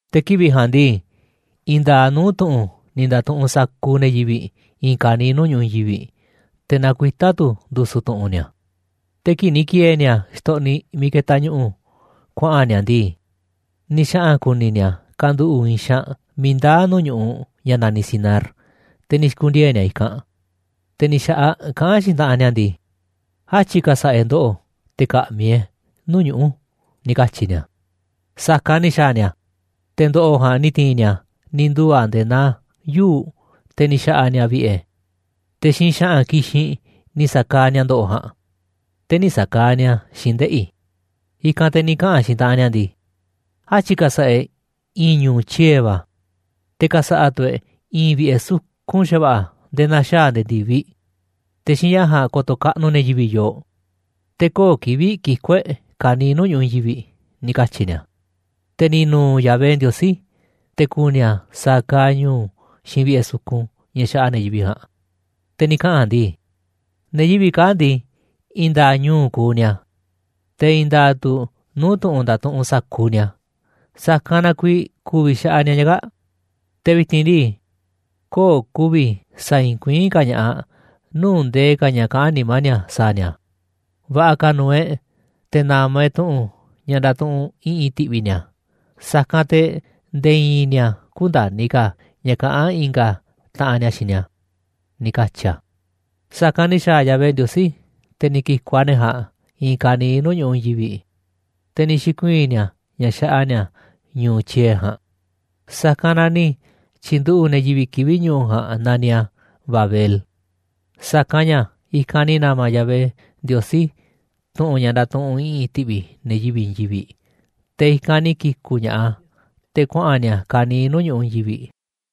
Te̱ kivi̱ꞌ ja̱a̱nꞌ ndii, i̱i̱n nda̱a̱ꞌ nuu̱ꞌ tu̱ꞌu̱n ni̱ nda̱tuꞌunꞌ sa̱kuuꞌ ne̱ yivi̱ꞌ i̱i̱n ka̱niiꞌ nuu̱ꞌ ñu̱ꞌuꞌ i̱i̱n yivi̱ꞌ, te̱ nakuitá tu̱ ndu̱su̱ tu̱ꞌu̱n ni̱a̱. Te̱ kii̱ꞌ ni̱ ki̱e̱e̱ ni̱a̱ xtoꞌniꞌ miiꞌ ketaꞌ ñu̱ꞌu̱ kuaꞌa̱n ni̱a̱ ndii, ni̱ xaꞌa̱n ku̱ni̱ ni̱a̱ kanduꞌu̱ꞌ i̱i̱n xaanꞌ miiꞌ ndaa̱ nuu̱ꞌ ñu̱ꞌuꞌ ña̱ na̱niꞌ Sinar, te̱ ni̱ xi̱ku̱ndiee̱ ni̱a̱ i̱kanꞌ. Te̱ ni̱ xa̱ꞌaꞌ kaꞌán xiinꞌ taꞌanꞌ ni̱a̱ ndii: ―Átyi̱ ka̱sa̱ꞌa̱ e̱ꞌ ndo̱ꞌo̱ te̱ ka̱ꞌmi̱ e̱ꞌ nuu̱ꞌ ñuꞌu̱ ―ni̱ katyi̱ ni̱a̱. Sa̱kanꞌ ni̱ xa̱a̱ ni̱a̱, te̱ ndo̱ꞌo̱ ja̱a̱nꞌ ni̱ ti̱i̱n ni̱a̱ ni̱ nduu̱ a̱ nde̱e̱ naa yuu̱ꞌ, te̱ ni̱ xa̱ꞌa̱ ni̱a̱ vi̱ꞌe̱, te̱ xiinꞌ xa̱ꞌa̱n ki̱xinꞌ ni̱ sa̱kaaꞌ ni̱a̱ ndo̱ꞌo̱ ja̱a̱nꞌ, te̱ nï̱ sa̱kaaꞌ ni̱a̱ xiinꞌ ndeꞌi̱. I̱kanꞌ te̱ ni̱ kaꞌa̱n xiinꞌ taꞌanꞌ ni̱a̱ ndii: ―Átyi̱ ka̱sa̱ꞌa̱ e̱ꞌ i̱i̱n ñu̱u̱ tyie̱ va̱, te̱ ka̱sa̱ꞌa̱ tu̱ e̱ꞌ i̱i̱n vi̱ꞌe̱ sukun xa̱va̱ꞌa̱ nde̱e̱ na̱xaa̱ a̱ nde̱e̱ ndi̱viꞌ. Te̱ xiinꞌ ña̱ ja̱a̱nꞌ ko̱to̱ kaꞌnuꞌ ne̱ yivi̱ꞌ yooꞌ, te̱ köo̱ꞌ kivi̱ꞌ kiku̱ e̱ꞌ ka̱niiꞌ nuu̱ꞌ ñu̱ꞌuꞌ i̱i̱n yivi̱ꞌ ―ni̱ katyi̱ ni̱a̱. Te̱ ni̱ nu̱u̱ Yahvé Ndiosí, te̱ ku̱ni̱ a̱ sa̱a̱ kaaꞌ ñu̱u̱ xiinꞌ vi̱ꞌe̱ sukun, ña̱ xaꞌa te̱ yivi̱ꞌ ja̱a̱nꞌ. Te̱ ni̱ kaꞌa̱n a̱ ndii: ―Ne̱ yivi̱ꞌ kaa̱ꞌ ndii, i̱i̱n nda̱a̱ꞌ ñu̱u̱ kuuꞌ ni̱a̱, te̱ i̱i̱n nda̱a̱ꞌ tu̱ nuu̱ꞌ tu̱ꞌu̱n ndatuꞌunꞌ sa̱kuuꞌ ni̱a̱. Sa̱kanꞌ na kuiiꞌ ku̱vi̱ xaꞌa ni̱a̱ ña̱ kaa̱ꞌ, te̱ vi̱ti̱n ndii, köo̱ꞌ ku̱vi̱ sa̱a̱ i̱i̱n kuiín ka̱ ña̱ꞌaꞌ nuu̱ꞌ ndee ka̱ ña̱ kaꞌán nimá ni̱a̱ sa̱a̱ ni̱a̱. Va̱ꞌa̱ ka̱ nu̱u̱ e̱ꞌ te̱ na̱ma̱ e̱ꞌ tu̱ꞌu̱n ña̱ ndatuꞌunꞌ i̱ꞌi̱n ti̱ꞌvi̱ ni̱a̱, sa̱kanꞌ te̱ nde̱e̱ i̱i̱n ni̱a̱ kü̱nda̱ni̱ ka̱ ña̱ kaꞌán i̱nga̱ taꞌanꞌ ni̱a̱ xiinꞌ ni̱a̱ ―ni̱ katyi̱ a̱. Sa̱kanꞌ ni̱ xa̱a̱ Yahvé Ndiosí, te̱ ni̱ ki̱ku̱ꞌ a̱ ne̱ ja̱a̱nꞌ i̱i̱n ka̱niiꞌ nuu̱ꞌ ñu̱ꞌuꞌ i̱i̱n yivi̱ꞌ, te̱ ni̱ xi̱kuii̱n ni̱a̱ ña̱ xaꞌa ni̱a̱ ñu̱u̱ tyie̱ ja̱a̱nꞌ. Sa̱kanꞌ na ni̱ tyi̱nduꞌu̱ꞌ ne̱ yivi̱ꞌ kivi̱ꞌ ñu̱u̱ ja̱a̱nꞌ naniꞌ a̱ Babel, sa̱kanꞌ ña̱ i̱kanꞌ ni̱ na̱ma̱ Yahvé Ndiosí tu̱ꞌu̱n ña̱ ndatuꞌunꞌ i̱ꞌi̱n ti̱ꞌvi̱ ne̱ yivi̱ꞌ i̱i̱n yivi̱ꞌ, te̱ i̱kanꞌ ni̱ ki̱ku̱ꞌ ña̱ꞌaꞌ a̱ te̱ kuaꞌa̱n ni̱a̱ ka̱niiꞌ nuu̱ꞌ ñu̱ꞌuꞌ i̱i̱n yivi̱ꞌ.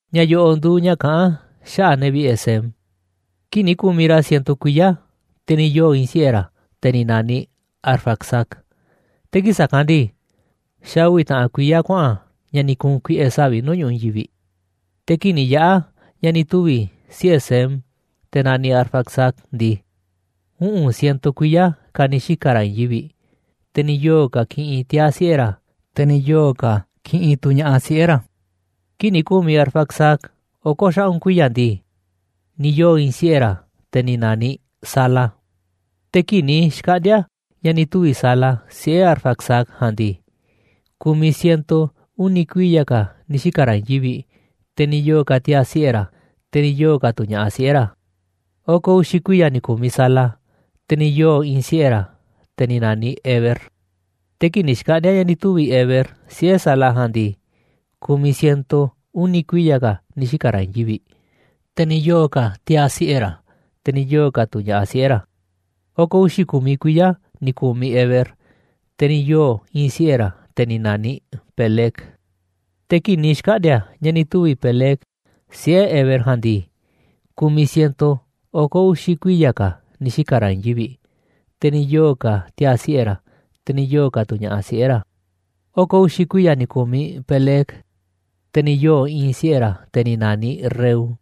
Ña̱ yo̱ꞌo̱ nduuꞌ ña̱ kaꞌán xaꞌa̱ꞌ ne̱ vi̱ꞌe̱ Sem. Kii̱ꞌ ni̱ ku̱miꞌ ra̱ ciento kuiya̱, te̱ ni̱ yoo̱ i̱i̱n siꞌe̱ ra̱, te̱ ni̱ na̱niꞌ Arfaxad. Te̱ kii̱ꞌ sa̱kanꞌ ndii, xa̱ uvi̱ taꞌan kuiya̱ kuaꞌa̱n ña̱ ni̱ ku̱u̱n kuiꞌe̱ savi̱ꞌ nuu̱ꞌ ñu̱ꞌuꞌ i̱i̱n yivi̱ꞌ. Te̱ kii̱ꞌ ni̱ yaꞌa̱ ña̱ ni̱ tuvi̱ siꞌe̱ Sem, te̱ naniꞌ Arfaxad ndii, uꞌu̱n ciento kuiya̱ ka̱ ni̱ xika̱ ra̱ i̱i̱n yivi̱ꞌ, te̱ ni̱ yoo̱ ka̱ kiꞌinꞌ tiaa̱ siꞌe̱ ra̱, te̱ ni̱ yoo̱ ka̱ kiꞌinꞌ tu̱ ña̱ꞌaꞌ siꞌe̱ ra̱. Kii̱ꞌ ni̱ ku̱miꞌ Arfaxad oko̱ xaꞌu̱n kuiya̱ ndii, ni̱ yoo̱ i̱i̱n siꞌe̱ ra̱, te̱ ni̱ na̱niꞌ Sala. Te̱ kii̱ꞌ ni̱ xkaꞌndi̱a̱ ña̱ ni̱ tuvi̱ Sala siꞌe̱ Arfaxad ja̱a̱nꞌ ndii, ku̱miꞌ ciento uni̱ kuiya̱ ka̱ ni̱ xika̱ ra̱ i̱i̱n yivi̱ꞌ, te̱ ni̱ yoo̱ ka̱ tiaa̱ siꞌe̱ ra̱, te̱ ni̱ yoo̱ ka̱ tu̱ ña̱ꞌaꞌ siꞌe̱ ra̱. Oko̱ uxi̱ kuiya̱ ni̱ ku̱miꞌ Sala, te̱ ni̱ yoo̱ i̱i̱n siꞌe̱ ra̱, te̱ ni̱ na̱niꞌ Heber. Te̱ kii̱ꞌ ni̱ xkaꞌndi̱a̱ ña̱ ni̱ tuvi̱ Heber siꞌe̱ Sala ja̱a̱nꞌ ndii, ku̱miꞌ ciento uni̱ kuiya̱ ka̱ ni̱ xika̱ ra̱ i̱i̱n yivi̱ꞌ, te̱ ni̱ yoo̱ ka̱ tiaa̱ siꞌe̱ ra̱, te̱ ni̱ yoo̱ ka̱ tu̱ ña̱ꞌaꞌ siꞌe̱ ra̱. Oko̱ uxi̱ ku̱miꞌ kuiya̱ ni̱ ku̱miꞌ Heber, te̱ ni̱ yoo̱ i̱i̱n siꞌe̱ ra̱, te̱ ni̱ na̱niꞌ Peleg. Te̱ kii̱ꞌ ni̱ xkaꞌndi̱a̱ ña̱ ni̱ tuvi̱ Peleg siꞌe̱ Heber ja̱a̱nꞌ ndii, ku̱miꞌ ciento oko̱ uxi̱ kuiya̱ ka̱ ni̱ xika̱ ra̱ i̱i̱n yivi̱ꞌ, te̱ ni̱ yoo̱ ka̱ tiaa̱ siꞌe̱ ra̱, te̱ ni̱ yoo̱ ka̱ tu̱ ña̱ꞌaꞌ siꞌe̱ ra̱. Oko̱ uxi̱ kuiya̱ ni̱ ku̱miꞌ Peleg, te̱ ni̱ yoo̱ i̱i̱n siꞌe̱ ra̱, te̱ ni̱ na̱niꞌ Reu.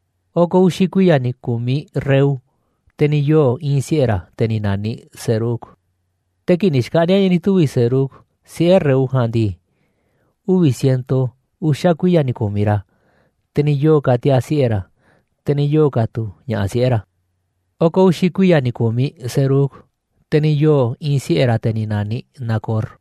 Oko̱ uxi̱ uvi̱ kuiya̱ ni̱ ku̱miꞌ Reu, te̱ ni̱ yoo̱ i̱i̱n siꞌe̱ ra̱, te̱ ni̱ na̱niꞌ Serug. Te̱ kii̱ꞌ ni̱ xkaꞌndi̱a̱ ña̱ ni̱ tuvi̱ Serug siꞌe̱ Reu ja̱a̱nꞌ ndii, uvi̱ ciento uxa̱ kuiya̱ ni̱ ku̱miꞌ ra̱, te̱ ni̱ yoo̱ ka̱ tiaa̱ siꞌe̱ ra̱, te̱ ni̱ yoo̱ ka̱ tu̱ ña̱ꞌaꞌ siꞌe̱ ra̱. Oko̱ uxi̱ kuiya̱ ni̱ ku̱miꞌ Serug, te̱ ni̱ yoo̱ i̱i̱n siꞌe̱ ra̱, te̱ ni̱ na̱niꞌ Nacor.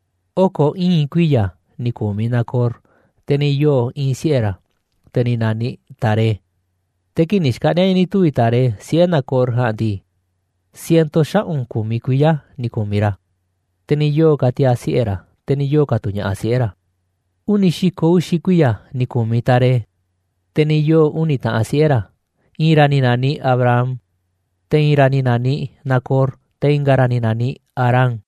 Oko̱ ii̱n kuiya̱ ni̱ ku̱miꞌ Nacor, te̱ ni̱ yoo̱ i̱i̱n siꞌe̱ ra̱, te̱ ni̱ na̱niꞌ Taré. Te̱ kii̱ꞌ ni̱ xkaꞌndi̱a̱ ña̱ ni̱ tuvi̱ Taré siꞌe̱ Nacor ja̱a̱nꞌ ndii, ciento xaꞌu̱n ku̱miꞌ kuiya̱ ni̱ ku̱miꞌ ra̱, te̱ ni̱ yoo̱ ka̱ tiaa̱ siꞌe̱ ra̱, te̱ ni̱ yoo̱ ka̱ tu̱ ña̱ꞌaꞌ siꞌe̱ ra̱. Uni̱ xi̱ko̱ uxi̱ kuiya̱ ni̱ ku̱miꞌ Taré, te̱ ni̱ yoo̱ uni̱ taꞌan siꞌe̱ ra̱, i̱i̱n ra̱ ni̱ na̱niꞌ Abram, te̱ i̱i̱n ra̱ ni̱ na̱niꞌ Nacor, te̱ i̱nga̱ ra̱ ni̱ na̱niꞌ Harán.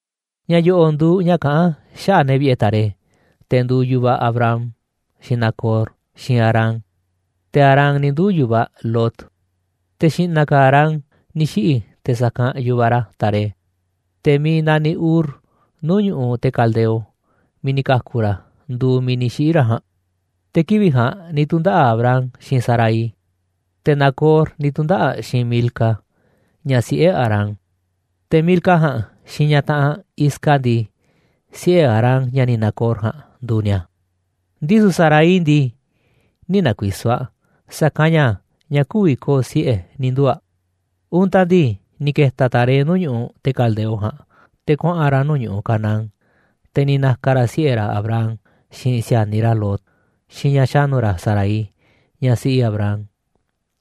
Ña̱ yo̱ꞌo̱ nduuꞌ ña̱ kaꞌán xaꞌa̱ꞌ ne̱ vi̱ꞌe̱ Taré, te̱ nduuꞌ yu̱vaꞌ Abram, xiinꞌ Nacor, xiinꞌ Harán, te̱ Harán ni̱ nduu̱ yu̱vaꞌ Lot. Te̱ xi̱ꞌna̱ ka̱ Harán ni̱ xiꞌi̱ te̱ sa̱kanꞌ yu̱vaꞌ ra̱ Taré. Te̱ miiꞌ naniꞌ Ur, nuu̱ꞌ ñu̱ꞌuꞌ te̱ Caldeo, miiꞌ ni̱ ka̱ku̱ ra̱ nduuꞌ miiꞌ ni̱ xiꞌi̱ ra̱ ja̱a̱nꞌ. Te̱ kivi̱ꞌ ja̱a̱nꞌ ni̱ tu̱ndaꞌa̱ꞌ Abram xiinꞌ Sarai, te̱ Nacor ni̱ tu̱ndaꞌa̱ꞌ xiinꞌ Milca, ña̱ siꞌe̱ Harán. Te̱ Milca ja̱a̱nꞌ, xiinꞌ ñaꞌ taꞌanꞌ aꞌ Isca ndii, siꞌe̱ Harán ña̱ni̱ Nacor ja̱a̱nꞌ nduuꞌ ni̱a̱. Ndisu̱ Sarai ndii, nï̱ na̱ku̱i̱so̱ aꞌ, sa̱kanꞌ ña̱ ñaꞌ kü̱vi̱ ko̱o̱ siꞌe̱ ni̱ nduu̱ aꞌ. Untaꞌ ndii, ni̱ ke̱ta̱ Taré nuu̱ꞌ ñu̱ꞌuꞌ te̱ Caldeo ja̱a̱nꞌ te̱ kuaꞌa̱n ra̱ nuu̱ꞌ ñu̱ꞌuꞌ Canaán, te̱ ni̱ na̱ka̱ ra̱ siꞌe̱ ra̱ Abram, xiinꞌ si̱a̱niꞌ ra̱ Lot, xiinꞌ ñaꞌ xa̱nu̱ ra̱ Sarai, ñaꞌ siꞌi Abram.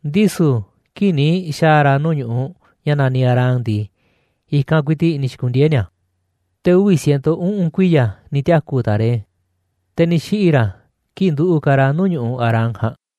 Ndisu̱ kii̱ꞌ ni̱ xa̱a̱ ra̱ nuu̱ꞌ ñu̱ꞌuꞌ ña̱ naniꞌ Harán ndii, i̱kanꞌ ku̱i̱ti̱ꞌ ni̱ xi̱ku̱ndiee̱ ni̱a̱. Te̱ uvi̱ ciento uꞌu̱n kuiya̱ ni̱ tiaku̱ Taré, te̱ ni̱ xiꞌi̱ ra̱ kii̱ꞌ nduꞌu̱ꞌ ka̱ ra̱ nuu̱ꞌ ñu̱ꞌuꞌ Harán ja̱a̱nꞌ.